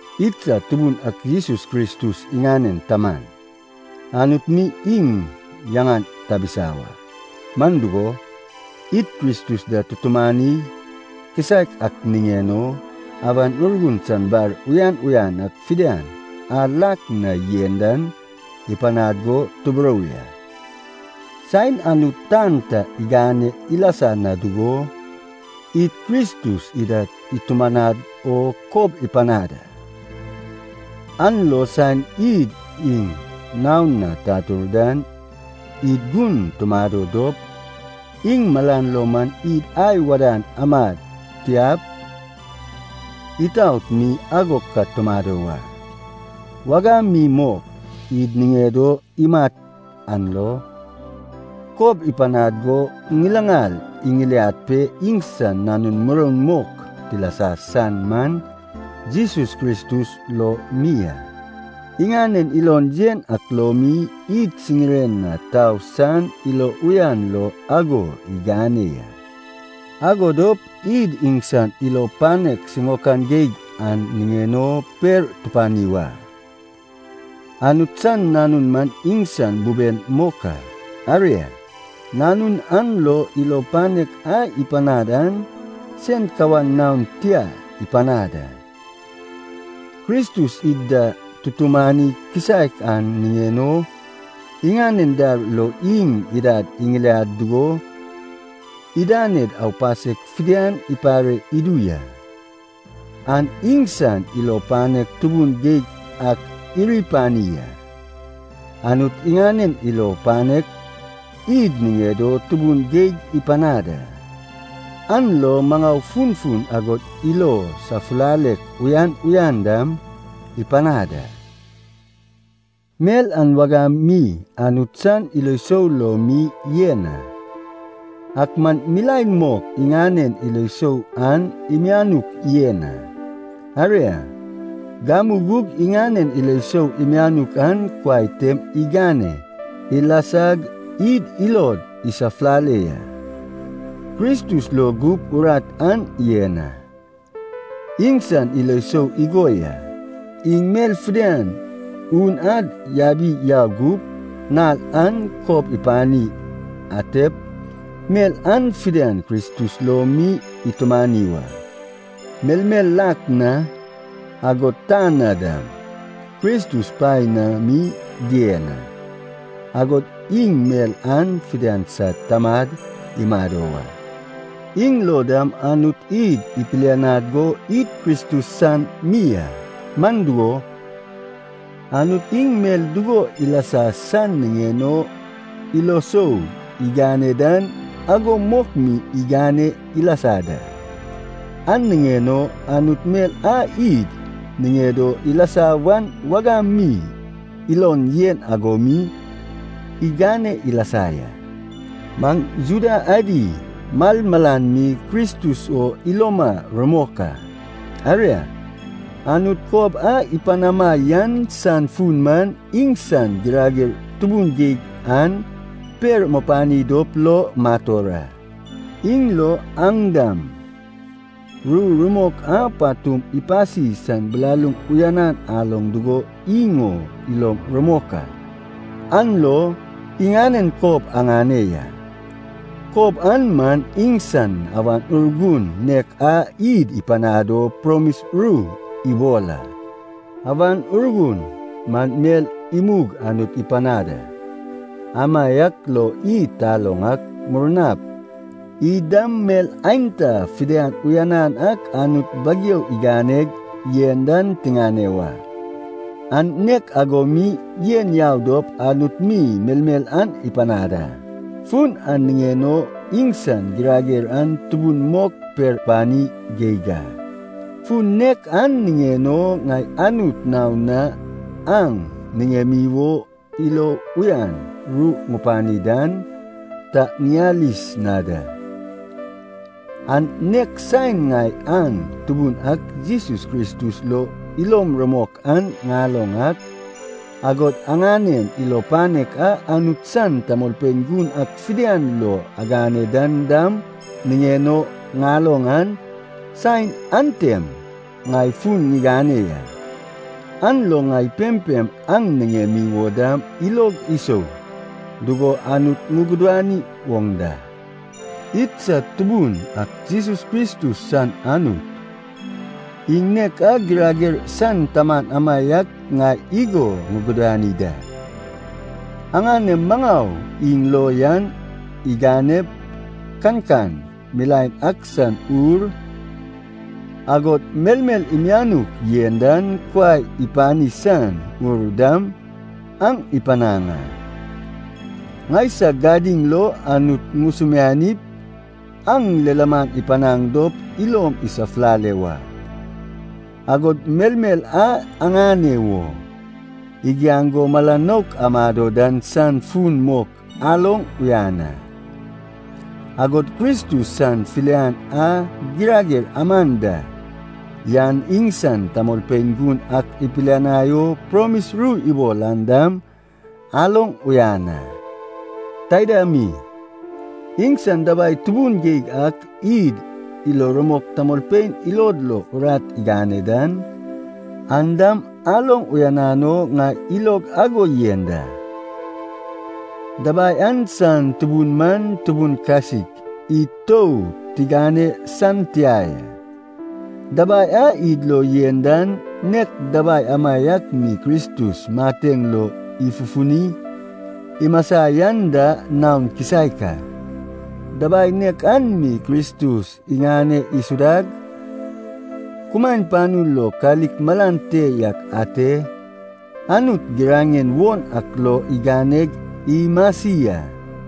Idsad Tubun ak Jesus Kristus iŋanen Taman, Anut mi iŋ yaŋan tabisa wa. Man dugo, id Kristus da tutumani kisaek ak niŋen o, Awan Urgun san bar uyan uyan ak fidian a lak na yen dan ipanad go tuburou ya. Saen Anut tan ta igane ilasa na dugo, id Kristus ida itumanad o kob ipanad a. An lo saen id iŋ naon na tatur dan, id gun tumado dop, iŋ malan lo man id ai wadan amad tiap itaot mi ago ka tumado wa. Wagam mi mok, id niŋed o imat an lo, kob ipanad go ŋilaŋal iŋiliad pe iŋsan nanun muroun mok tilasa san man Jesus Kristus lo mi a. Iŋanen ilon yen ak lo mi, id siŋiren na tau san ilo uyan lo ago igane ya. Ago dop id iŋsan ilo panek siŋaokan geig an niŋen o per tupani wa. Anut san Nanun man iŋsan buben mok a. Aria, Nanun an lo ilo panek a ipanad an sen kawan naon tia ipanad a. Kristus id da tutumani kisaek an niŋen o, iŋanen dar lo iŋ idad iŋiliad dugo idaned aupasek fidian ipare idu ya. An iŋsan ilo panek tubun geig ak iri pani a. Anut iŋanen ilo panek id niŋed o tubun geig ipanad a. An lo maŋau funfun agod ilo safulalek uyan uyan dam ipanad a. Mel an wagam mi Anut san ilo sou lo mi yen a. Ak man milaen mok iŋanen ilo sou an imianuk yen a. Aria, gamu gug iŋanen ilo sou imianuk an kuai tem igane ilasag id ilod isafulale ya. Kristus lo gup urat an yen a. Iŋsan ilo sou igo ya, iŋ mel fidian un ad yabip yau gup, nal a kob ipani antep, mel an fidian Kristus lo mi itumani wa. Melmel lak na, agod tan na dam, Kristus paen na mi dien a, agod iŋ mel an fidian sad tamad imado wa. Iŋ lo dam Anut id ipilianad go id Kristus san mi a. Man dugo, Anut iŋ mel dugo ilasa san niŋen o ilo sou igane dan ago mok mi igane ilasa da. An niŋen o Anut mel a id niŋed o ilasa wan wagam mi ilon yen ago mi igane ilasa ya. Maŋ Juda adi malmalan mi Kristus o iloma rumok a. Aria, Anut kob a ipanama yan san fun man, iŋsan girager tubun geig an per mupani dop lo mator a. Iŋ lo aŋ dam, ru rumok a patum ipasi san bilaluŋ uyanan aloŋ dugo iŋ o ilom rumok a, an lo iŋanen kob aŋane ya. Kob an man iŋsan Awan Urgun nek a id ipanad o promis ru ibol a. Awan Urgun man mel imug Anut ipanad a, amaiak lo id taloŋ ak, murnap id dam mel aenta fidian uyanan ak Anut bageu iganeg yen dan tiŋane wa. An nek ago mi yen yau dop Anut mi melmel an ipanad a. Fun an niŋen o iŋsan girager an tubun mok per tupani geig a. Fun nek an niŋen o ŋai Anut naon na aŋ niŋemi wo ilo uyan ru ŋupani dan, ta ŋiyalis na da. An nek saen ŋai aŋ Tubun ak Jesus Kristus lo ilom rumok an ŋaloŋ ak, agod aŋanem ilo panek a Anut san tamolpein gun ak fidian lo agane dan dam niŋen o ŋaloŋ an, saen antem ŋai fun ŋigane ya. An lo ŋai pempem aŋ niŋemi wo dam ilog isou dugo Anut ŋugudani woŋ da. Idsad Tubun ak Jesus Kristus san Anut, iŋ nek a girager san Taman amaiak ŋai igo ŋugudani da. Aŋanem maŋau iŋ lo yan iganep, kankan milaen ak san ur, agod melmel imianuk yen dan kuai ipani san ur dam aŋ ipanaŋ a. Ŋaisag gadiŋ lo Anut ŋusumianip aŋ lilaman ipanaŋ dop ilom isafulale wa. Agod melmel a aŋane wo igiaŋ go mala nouk amado dan san fun mok aloŋ uyan a. Agod Kristus san filian a girager aman da yan iŋsan tamolpein gun ak ipidinai o promis ru ibol an dam aloŋ uyan a. Taida mi, iŋsan dabai tubun geig ak id ilo rumok tamolpein ilod lo urat igane dan, an dam aloŋ uyanan o ŋai ilog ago yen da. Dabai an san tubun man tubun kasik id tou tigane san tia ya. Dabai a id lo yen dan nek dabai amaiak mi Kristus mateŋ lo ifufuni imasa yan da naon kisaek a. Dabai nek an mi Kristus iŋane isudag, kumaen panu lo kalik malan te yak ate, Anut giraŋen won ak lo iganeg imasi a.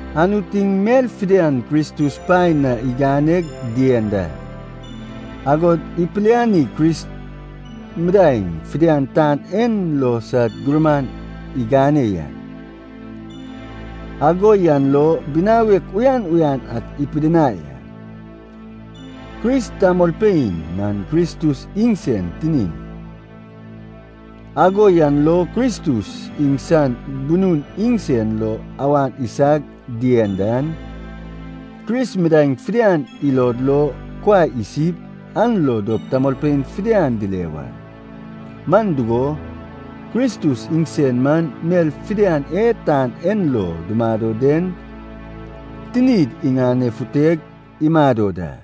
Anut iŋ mel fidian Kristus paen na iganeg dien da. Agod ipilianig Kris midaeŋ fidian tan en lo sad gurman igane ya. Ago yan lo binawek uyan uyan ak ipidinai a. Kris tamolpein man Kristus iŋsen tinin. Ago yan lo Kristus iŋsan bunun iŋsen lo awan isag yen dan, Kris midaeŋ fidian ilod lo kuai isip, an lo dop tamolpein fidian dile wa. Man dugo, Kristus iŋsen man mel fidian e tan en lo dumado den tinid iŋanefuteg imado da.